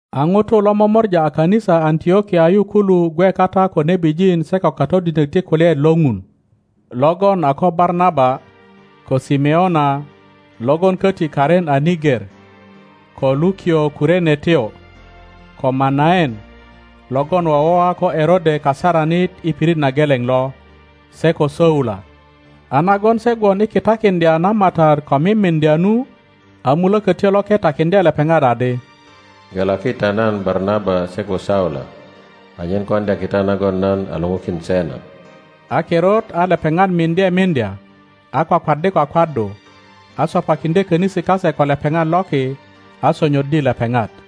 A ŋutu lo momora a kanisa Antlokia yu kulu gwe kata ko nebijin se ko katodinök ti kulyaet lo Ŋun, logon a ko Barnaba, ko Simeona (logon köti karin a Niger,) ko Lukio Kurenetyo, ko Manaen (logon wowoa ko Erode kasaranit i pirit na geleŋ lo), se ko Saula. a nagon se gwon i kitakiŋdya na Matat ko mimiŋdya nu, a Mulökötyo Loke takiŋdye lepeŋat adi, Gelaki ta nan Barnaba se ko Saula anyen koŋdya kita nagon nan a luŋukin se na. A kirut a lepeŋat miŋdye miŋdya, a kwakwaddi kwakwaddu, a sopakiŋdye könisi kase ko lepeŋat loki, a sonyoddi lepeŋat.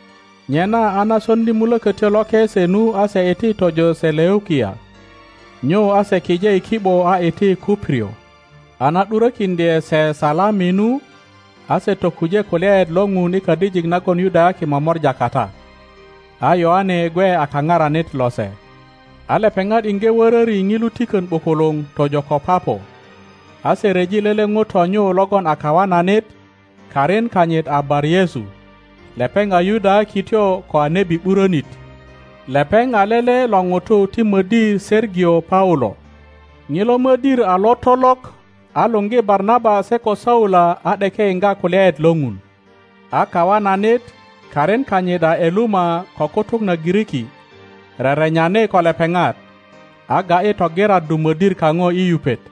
Nyena a na soŋdi Mulökötyo Loke se nu a se iti tojo Seleukia; nyu a se kije i ki ’bo a iti Kuprio. A na ’ŋurokiŋdye se Salami nu, a se tokuje kulyaet lo Ŋun i kadijik nagon Yudayaki momora kata. A Yoane gwe a kaparanit lose. A lepeŋat iŋge wöröri ŋilu tikön ’bukuluŋ tojo ko Papo, a se ryeji lele ŋuto nyu logon a kawananit, karin kanyit a Bar-Yesu, lepeŋ a Yudayakityo ko a nebi ’burönit. Lepeŋ a lele lo ŋutu ti mödir Sergio Paulo. Ŋilo mödir a lotolok, a luŋgi Barnaba se ko Saula a ’deke yiŋga kulyaet lo ŋun. A kawananit, karin kanyit a Eluma ko kutuk na Giriki, rerenyani ko lepeŋat, a ga ’yi togiraddu mödir kaŋo i yupet.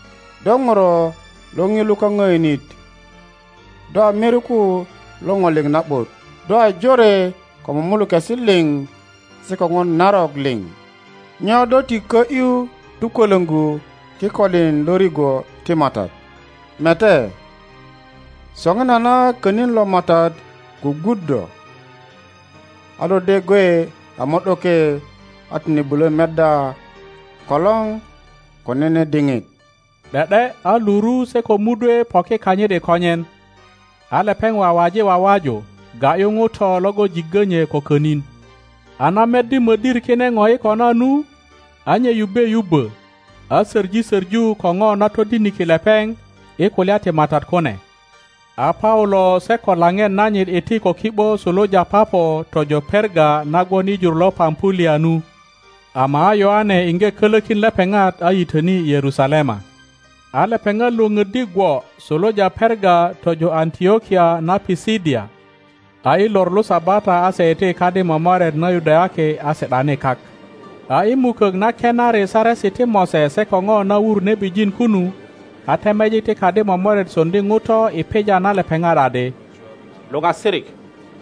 Do nuro lo Ŋilo kaŋöönit, do a miriku lo Ŋo liŋ na ’but, do a jore ko mumulukesi liŋ se ko ŋo narok liŋ. Nyo do ti kö ’yu tukwölöŋgu kikolin lo rigwo ti Matat? Mete, soŋinana konin lo Matat gwugwut do, a do de gwe a mo ’doke a tine bulo meddya kolor ko nene diŋit. ’De ’de a luru se ko mudwe poki kanyit i konyen, a lepeŋ wawaji wawaju ga ’yu ŋuto logon jiggö nye ko könin. A na meddi mödir kire ŋo i kona nu, a nye yubbe yubbo, a soŋi soŋu ko ŋo na todiniki lepeŋ i kulya ti Matat kune. A Paulo se ko laŋet nanyit iti ko ki ’bo suluja Papo tojo Perga na gwon i jur lo Pampulia nu; ama a Yoane iŋge kolokin lepeŋat a yitöni Yerusalema. A lepeŋat Iwoŋöddi gwo suluja Perga tojo Antlokia na Pisidia. A i lor lo Sabata a se iti i kadi momoret na Yudayaki a si ’dani kak. A i mukök na kenari Saresi ti Mose se ko ŋo na wur nebijin kunu, a temejik ti kadi momoret soŋdi ŋuto i pija na lepeŋat adi, Luoasirik,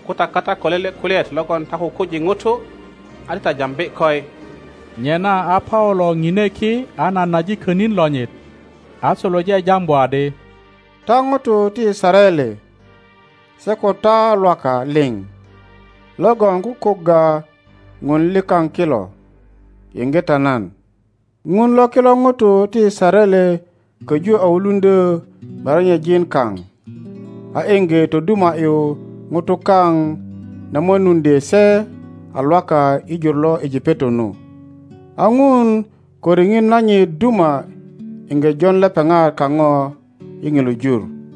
ko ta kata ko lele kulyaet logon ta kukuji ŋutu, a ti ta jambi koi. Nyena a Paulo ŋine ki a nanaji könin lonyit, a suluje jambu adi: Ta ŋutu ti Yisaraele se ko ta Lwaka liŋ logon kukugga Ŋun likaŋ kilo, yiŋge ta nan! Ŋun lo kilo ŋutu ti Yisaraele köju a wuluŋdyö merenyejin kaŋ a iŋge toduma ’yu ŋutu kaŋ na mönuŋdye se a Lwaka i jur lo Ejipeto nu. A Ŋun ko riŋit nanyit duma iŋge jon lepeŋat kaŋo i ŋilu jur,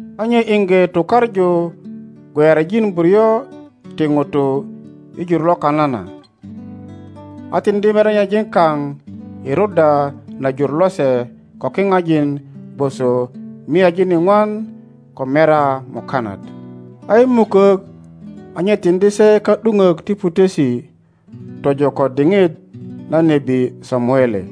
a nye iŋge tukaŋu gweyarijin buryo ti ŋutu i jur lo Kanana, a tiŋdi merenyejin kaŋ iruddya na jur lose ko kiŋajin gwoso miajin iŋwan ko merya mukanat. Sam 3.20a i mukök a nye tiŋdi se ka ’duŋök ti putesi tojo ko diŋit na nebi Samuele.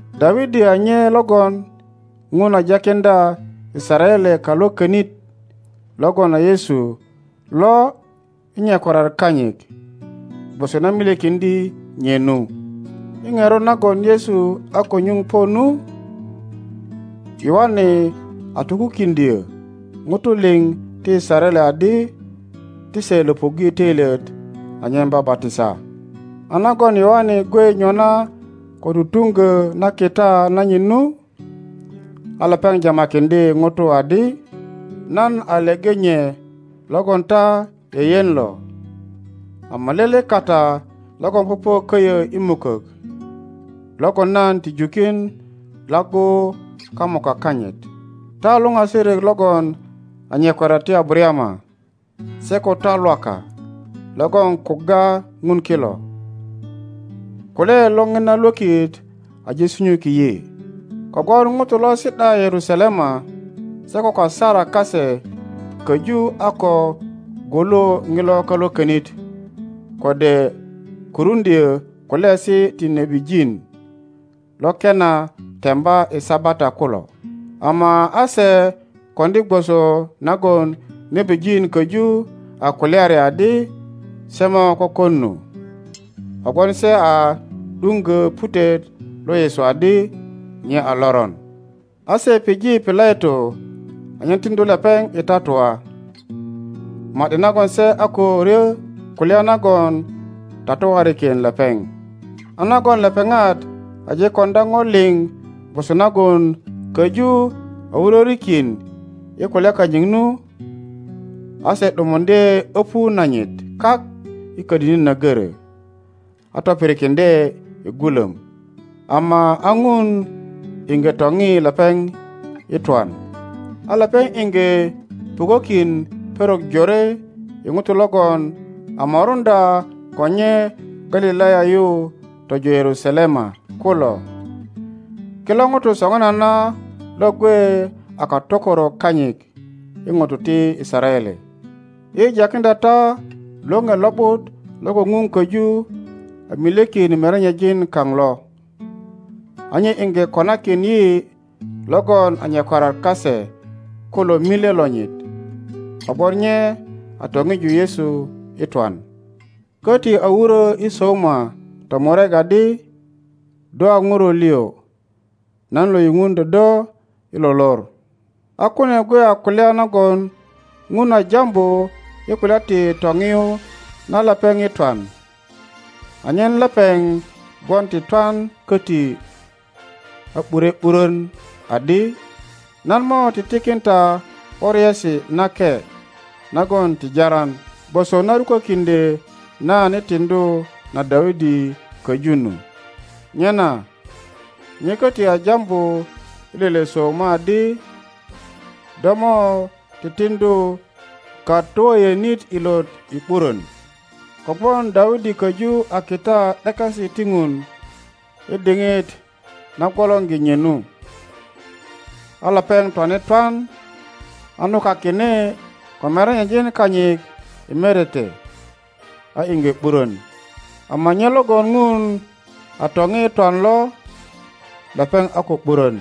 Dawidi a nye logon Ŋun a jakiŋdya Yisaraele Kalwökonit logon a Yesu lo i nyakwariat kanyit, gwoso na milyekiŋdye nye nu. I ŋerot nagon Yesu a ko nyuŋ po nu, Yoane a tokukiŋdyö ŋutu liŋ ti Yisaraele adi ti se löpuŋge toilyet anyen babatisa. a nagon Yoane gwe nyona ko tutuŋgö na kita nanyit nu, a lepeŋ jamakiŋdye ŋutu adi, Nan a leŋe nye logon ta yeyen lo, ama lele kata logon popo köyö i mukok logon nan ti jukin laggu kamuka kanyit. Ta luŋasirik logon a nyakwariat ti Abarayama se ko ta Lwaka logon kugga Ŋun kilo, kulyaet lo ŋina lwökit aje sunyuki yi. Kogwon ŋutu lo si ’da Yerusalema se ko kasarak kase köju a ko gwulu ŋilo Kalwökonit kode kuruŋdyö kulyaesi ti nebijin lo kena temba i Sabata kulo, ama a se koŋdi gwoso nagon nebijin köju a kulyari adi se mo kökon nu, kogwon se a ’duŋgö putet lo Yesu adi nye a loron. A se pije Pilato anyen tiŋdu lepeŋ i tatua, ma ’di nagon se a ko ryö kulya nagon tatuarikin lepeŋ. a nagon lepeŋat aje koŋdya ŋo liŋ gwoso nagon köju a wurörikin i kulya kanyit nu, a se ’dumuŋdye öpu nanyit kak i kodini na goro, a topirikiŋdye i gulöm. Ama a Ŋun iŋge toŋi lepeŋ i twan; a lepeŋ iŋge pukokin perok jore i ŋutu logon a moruŋdya ko nye Galilaya yu tojo Yerusalema kulo. Kilo ŋutu soŋinana lo gwe a katokorok kanyit i ŋutu ti Yisaraele. yi jakiŋdya ta Loŋe Lo ’but logon Ŋun köju a milyekin merenyejin kaŋ lo, a nye iŋge konakin yi logon a nyakwariat kase kulo milye lonyit, kogwon nye a toŋu Yesu i twan; köti a wurö i Sauma tomurek adi: Do a Ŋuro liŋ, nan lo yupuŋdyö do i lo lor. A kune gwe a kulya nagon Ŋun a jambu i kulya ti toŋiyu na lepeŋ i twan, anyen lepeŋ gwon ti twan köti a bure ’burön, adi, Nan mo titikin ta ’boriesi nake nagon ti jaran, gwoso na rukökiŋdye nan i tiŋdu na Dawidi köju nu. Nyena nye köti a jambu i lele Sauma adi, Do mo ti tiŋdu katwöyönit ilot i ’burön. Kogwon Dawidi köju a kita ’dekesi ti Ŋun i diŋit na gwolorgi nye nu, a lepeŋ twane twan a nukakine ko merenyejin kanyit i merete, a iŋge ’burön. Ama nye logon Ŋun a toŋi i twan lo, lepeŋ a ko ’burön.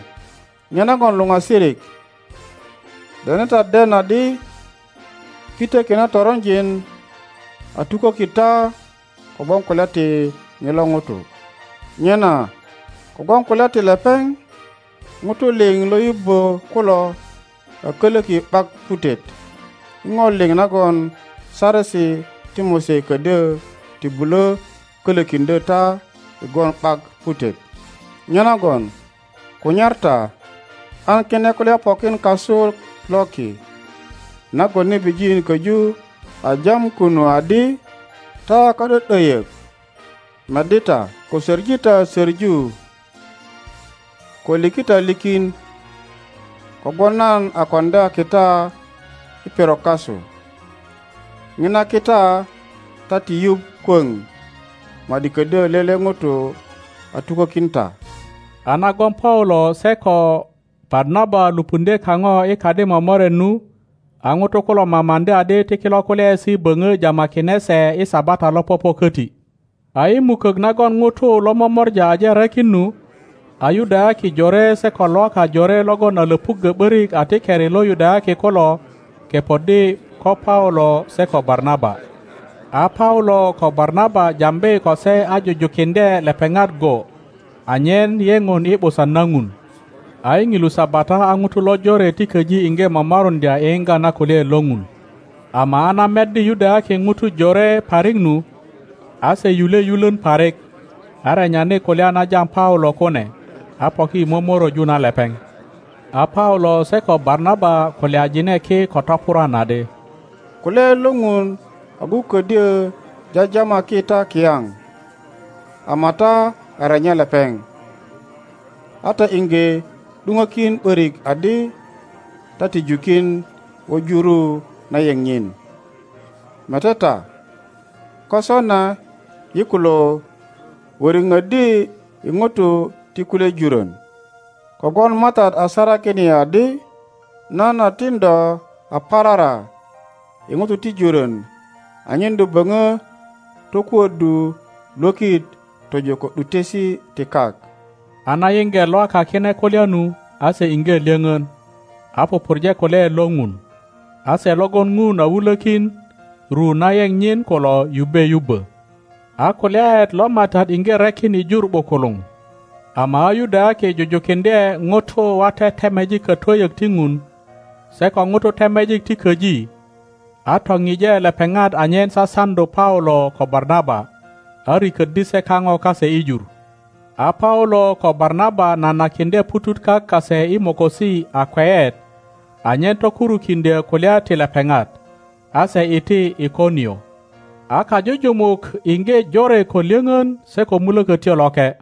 Nyenagon luŋasirik, dene ta den adi pitöki na toronjin a tuköki ta kogwon kulya ti ŋilo ŋuto. Nyena kogwon kulya ti lepeŋ, ŋutu liŋ lo yubbö kulo a kölöki ’bak putet i ŋo liŋ nagon Saresi ti Mose ködyö ti bulö kölökiŋdyö ta i gwon ’bak putet. Nyenagon kunyar ta an kine kulya pokin kasu loki nagon nebijin köju a jam kunu adi, Ta ka ’dö ’döyök meddi ta, ko söŋi ta söŋu, ko liki ta likin, kogwon nan a koŋdya kita i perok kasu. ŋina kita ta ti yuŋ kwöŋ ma ’di ködyö lele ŋuto a tukökin ta. A nagon Paulo se ko Barnaba lupundye kaŋo i kadi momoret nu, a ŋutu kulo mamaŋdi adi ti kilo kulyaesi böŋö jamakine se i Sabata lo popo köti. A i mukök nagon ŋutu lo momora aje rekin nu, a Yudayaki jore seko Lwaka jore logon a löpuggö ’börik a ti keri lo Yudayaki kulo kepoddi ko Paulo se ko Barnaba. A Paulo ko Barnaba jambi ko se a jujukiŋdye lepeŋat go anyen yeŋon i ’busan na Ŋun. A i ŋilu Sabata a ŋutu lojore ti köji iŋge momoruŋdya i yiŋga nakulyaet lo Ŋun. Ama a na meddi Yudayaki ŋutu jore parik nu, a se yule yulön parik, a renyani kulya na jam Paulo kune, a poki i momoröju na lepeŋ. a Paulo se ko Barnaba kulyajine ki ko topurwan adi, Kulyaet lo Ŋun agu ködyö jajamaki ta kiyaŋ, ama ta a renya lepeŋ, a ta iŋge ’duŋökin ’börik adi ta ti jukin wuju ru na yeŋ nyin, mete ta, ko sona yi kulo wöriŋoddi i ŋutu ti kulye jurön. Kogwon Matat a sarakin yi adi, Nan a tin do a parara i ŋutu ti jurönanyen do böŋö tokuöddu lwökit tojo ko ’dutesi ti kak. A na yiŋge Lwaka kine kulya nu, a se iŋge lyöŋon, a pupurje kulyaet lo Ŋun, a se logon Ŋun a wulökin ru na yeŋ nyin kulo yubbe yubbö. A kulyaet lo Matat iŋge rekin i jur ’bukuluŋ. Ama a Yudayaki jujukiŋdye ŋutu wate temejik katwöyök ti Ŋun, se ko ŋutu temejik ti köji, a toŋŋe lepeŋat anyen sasaŋdu Paulo ko Barnaba, a rikoddi se kaŋo kase i jur. A Paulo ko Barnaba nanakiŋdye ŋutut kak kase i mokosi a kweyet anyen tokurukiŋdyö kulya ti lepeŋat, a se iti Ikonio. A kajujumuk iŋge jore ko lyöŋön se ko Mulökötyo Loke.